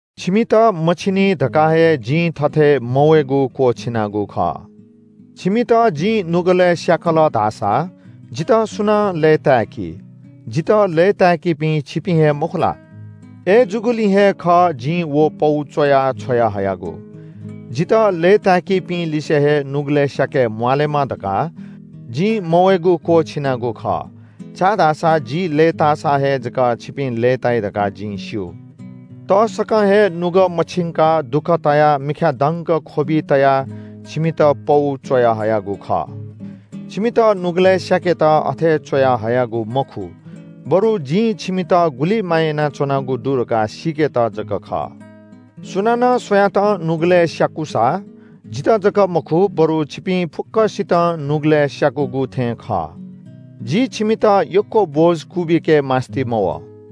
छिमित मछिनी धकाः हे जिं थथे मवयेगु क्‍वःछिनागु खः। छिमित जिं नुगलय् स्‍याकल धाःसा जितः सुनां लय्‌ताय्‌की? जितः लय्‌ताय्‌कीपिं छिपिं हे मखु ला? अय्‌जूगुलिं हे खः जिं व पौ च्‍वयाः छ्वयाहयागु। जितः लय्‌ताय्‌कीपिंलिसे हे नुगलय् स्‍याके म्‍वाःलेमा धकाः जिं मवयेगु क्‍वःछिनागु खः, छाय्‌धाःसा जि लय्‌ताःसा हे जक छिपिं लय्‌ताइ धकाः जिं स्‍यू। तसकं हे नुगः मछिंकाः दुःख तायाः मिखाय् दंक ख्‍वबि तयाः छिमित पौ च्‍वयाहयागु खः। छिमित नुगलय् स्‍याकेत अथे च्‍वयाहयागु मखु, बरु जिं छिमित गुलि माया यानाच्‍वनागु दु धकाः सीकेत जक खः। सुनानं सुयातं नुगलय् स्‍याकूसा, जितः जक मखु बरु छिपिं फुक्‍कसितं नुगलय् स्‍याकूगु थें खः। जि छिमित यक्‍व बोझ क्‍वबिके मास्‍ति मवः।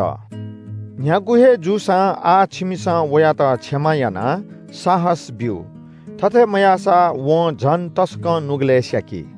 न्‍ह्यागु हे जूसां आः छिमिसं वयात क्षमा यानाः साहस ब्‍यु। थथे मयाःसा वं झन तसकं नुगलय् स्‍याकी।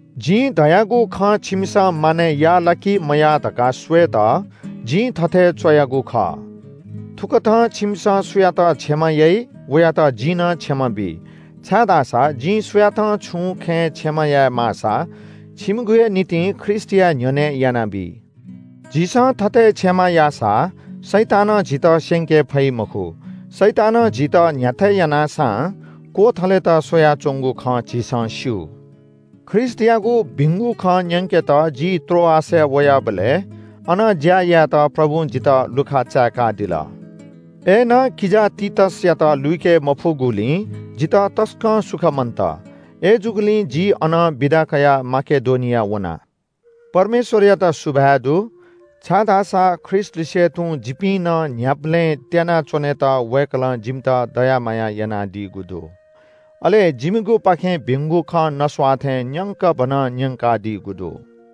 जिं धयागु खँ छिमिसं मानय् याः ला कि मयाः धकाः स्‍वयेत जिं थथे च्‍वयागु खः। थुकथं छिमिसं सुयात क्षमा याइ वयात जिं नं क्षमा बी। छाय्‌धाःसा जिं सुयातं छुं खँय् क्षमा याये माःसा छिमिगु हे निंतिं ख्रीष्‍टया न्‍ह्यःने यानाबी। झीसं थथे क्षमा याःसा शैतानं झीत स्‍यंके फइ मखु। शैतानं झीत न्‍ह्याथे यानाः सां क्‍वथलेत स्‍वयाच्‍वंगु खँ झीसं स्‍यू। ख्रीष्‍टयागु भिंगु खँ न्‍यंकेत जि त्रोआसय् वयाबलय् अन ज्‍या यायेत प्रभुं जितः लुखा चाय्‌कादिल। अय्‌नं किजा तीतसयात लुइके मफुगुलिं जितः तसकं सुख मन्‍त। अय्‌जूगुलिं जि अनं बिदा कयाः माकेडोनिया वना। परमेश्‍वरयात सुभाय् दु, छाय्‌धाःसा ख्रीष्‍टलिसे तुं जिपिं नं न्‍ह्याबलें त्‍याना च्‍वनेत वय्‌कलं जिमित दया माया यानादीगु दु। अले जिमिगुपाखें भिंगु खँ नस्‍वाः थें न्‍यंकभनं न्‍यंकादीगु दु।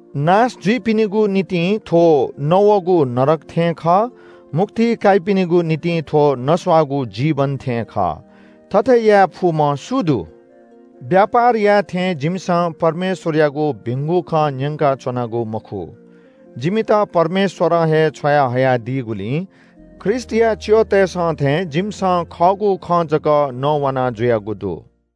नाश जुइपिनिगु निंतिं थ्‍व नवःगु नरक थें खः, मुक्ति काइपिनिगु निंतिं थ्‍व नस्‍वाःगु जीवन थें खः। थथे याये फुम्‍ह सु दु? व्‍यापार याये थें जिमिसं परमेश्‍वरयागु भिंगु खँ न्‍यंकाच्‍वनागु मखु। जिमित परमेश्‍वरं हे छ्वया हयादीगुलिं ख्रीष्‍टया च्‍यःतय्‌सं थें जिमिसं खःगु खँ जक नवानाजुयागु दु।